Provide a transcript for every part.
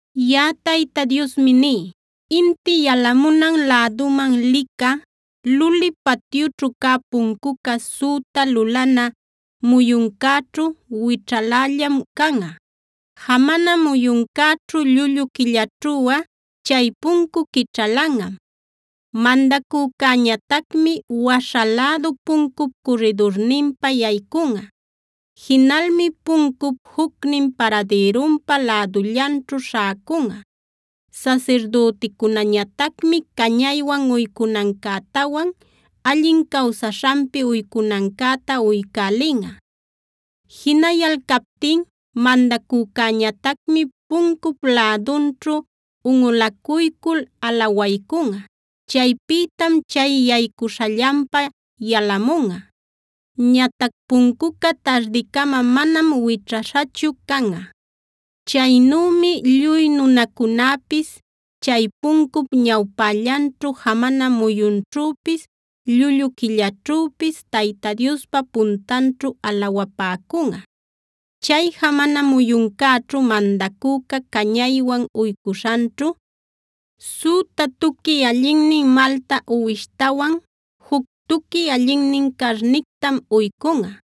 “Yaꞌa Tayta Diosmi ní: Inti yalamunan läduman licä, luli patyućhu cä puncuca süta lulana muyuncäćhu wićhalällam canꞌa. Jamana muyuncäćhu, llullu quillaćhuꞌa chay puncu quićhalanꞌam. Mandacücäñatacmi waśha lädu puncup curridurninpa yaycunꞌa. Jinalmi puncup jucnin paradïrunpa lädullanćhu śhäcunꞌa. Sasirdüticunäñatacmi cañaywan uycunancätawan allin cawsaśhanpi uycunancäta uycälinꞌa. Jinayalcaptin mandacücäñatacmi puncup lädunćhu unꞌulacuycul alawaycunꞌa. Chaypïtam chay yaycuśhallanpa yalamunꞌa. Ñatac puncuca tardicama manam wićhaśhachu canꞌa. Chaynümi lluy nunacunäpis, chay puncup ñawpällanćhu jamana muyunćhüpis, llullu quillaćhüpis Tayta Diospa puntanćhu alawapäcunꞌa. “Chay jamana muyuncäćhu mandacüca cañaywan uycuśhanćhu, süta tuqui allinnin malta uwishtawan juc tuqui allinnin carnictam uycunꞌa.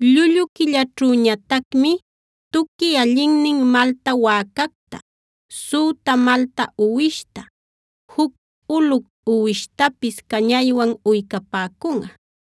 Llullu quillaćhüñatacmi tuqui allinnin malta wäcacta, süta malta uwishta, juc ulu uwishtapis cañaywan uycapäcunꞌa.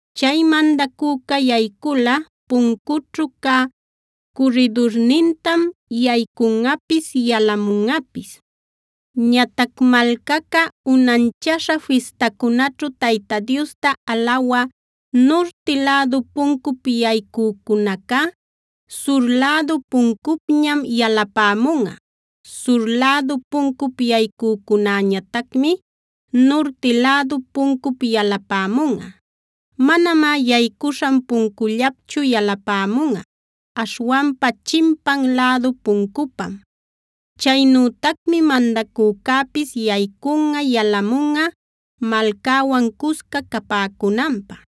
Chay mandacüca yayculꞌa puncućhu cä curridurnintam yaycunꞌapis yalamunꞌapis. “Ñatac malcaca, unanchaśha fistacunaćhu Tayta Diosta alawä nurti lädu puncup yaycücunacá, sur lädu puncupñam yalapämunꞌa. Sur lädu puncup yaycücunäñatacmi nurti lädu puncup yalapämunꞌa. Manamá yaycuśhan puncullapchu yalapämunꞌa, aśhwanpa chimpan lädu puncupam. Chaynütacmi mandacücäpis yaycunꞌa yalamunꞌa malcäwan cusca capäcunanpä.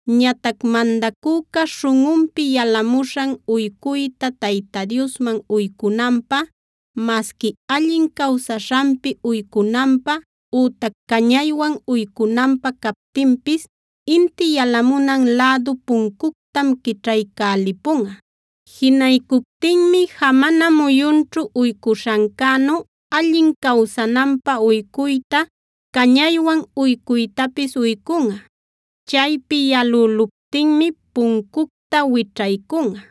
Ñatac mandacüca śhunꞌunpi yalamuśhan uycuyta Tayta Diosman uycunanpä, masqui allin cawsaśhanpi uycunanpä ütac cañaywan uycunanpä captinpis inti yalamunan lädu puncuctam quićhaycälipunꞌa. Jinaycuptinmi jamana muyunćhu uycuśhancänu allin cawsananpä uycuyta, cañaywan uycuytapis uycunꞌa. Chaypi yalüluptinmi puncucta wićhaycunꞌa.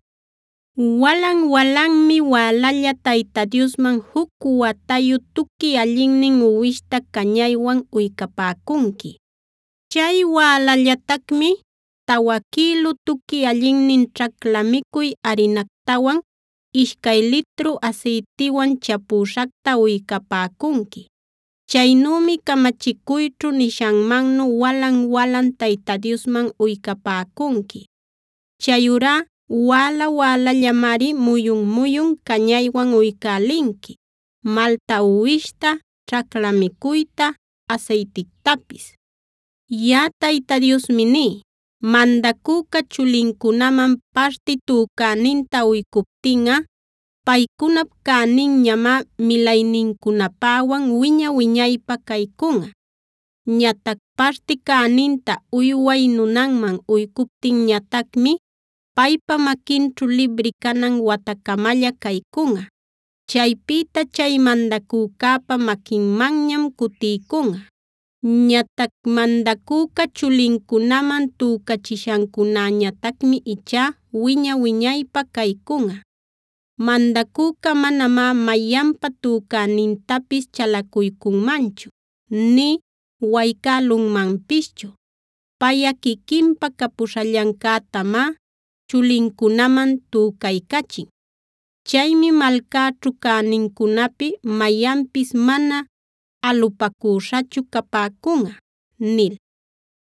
“Walan-walanmi wälalla Tayta Diosman juc watayu tuqui allinnin uwishta cañaywan uycapäcunqui. Chay wälallatacmi tawa quïlu tuqui allinnin ćhacla micuy arinactawan ishcay litru asaytiwan chapüśhacta uycapäcunqui. Chaynümi camachicuyćhu nishanmannu walan-walan Tayta Diosman uycapäcunqui. Chayurá wäla-wälallamari muyun-muyun cañaywan uycälinqui: malta uwishta, ćhacla micuyta, asaytictapis. “Yaꞌa Tayta Diosmi ní: Mandacüca chulincunaman parti tücäninta uycuptinꞌa, paycunap cäninñamá milaynincunapäwan wiña-wiñaypä caycunꞌa. Ñatac parti cäninta uyway nunanman uycuptinñatacmi paypa maquinćhu libri canan watacamalla caycunꞌa. Chaypïta chay mandacücäpa maquinmanñam cutiycunꞌa. Ñatac mandacüca chulincunaman tücachishancunäñatacmi ichá wiña-wiñaypä caycunꞌa. Mandacüca manamá mayanpa tücänintapis chalacuycunmanchu, nï waycälunmanpischu. Payꞌa quiquinpa capuśhallancätamá chulincunaman tücaycachin. Chaymi malcäćhu cänincunapi mayanpis mana alupacüśhachu capäcunꞌa” nil.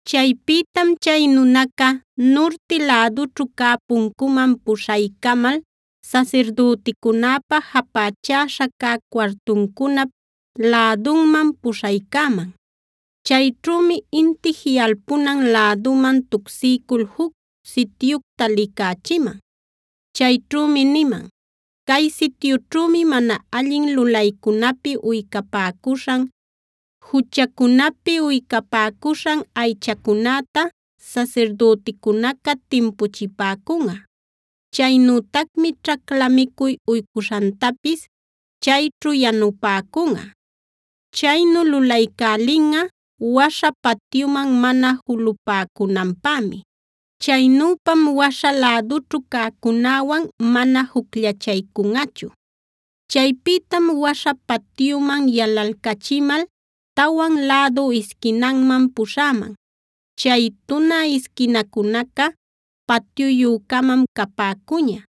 Chaypïtam chay nunaca, nurti lädućhu cä puncuman puśhaycamal sasirdüticunäpa japächäśha cä cuartuncunap lädunman puśhaycäman. Chayćhümi inti jiꞌalpunan läduman tucsiycul juc sityucta licächiman. Chayćhumi niman: “Cay sityućhümi mana allin lulaycunapi uycapäcuśhan, juchacunapi uycapäcuśhan aychacunäta sasirdüticunaca timpuchipäcunꞌa. Chaynütacmi ćhacla micuy uycuśhantapis chayćhu yanupäcunꞌa. Chaynu lulaycälinꞌa waśha patyuman mana julupäcunanpämi. Chaynüpam waśha lädućhu cäcunäwan mana jucllachaycunꞌachu. “Chaypïtam waśha patyuman yalalcachimal tawan lädu isquinanman puśhäman. Chay tunä isquinacunaca patyuyü-camam capäcuña.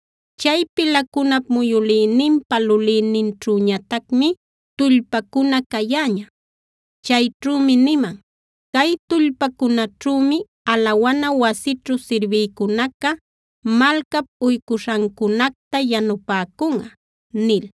Chay pilacunap muyülïninpa lulïninćhüñatacmi tullpacuna cayäña. Chayćhümi niman: ‘Cay tullpacunaćhümi alawana wasićhu sirbïcunaca malcap uycuśhancunacta yanupäcunꞌa’” nil.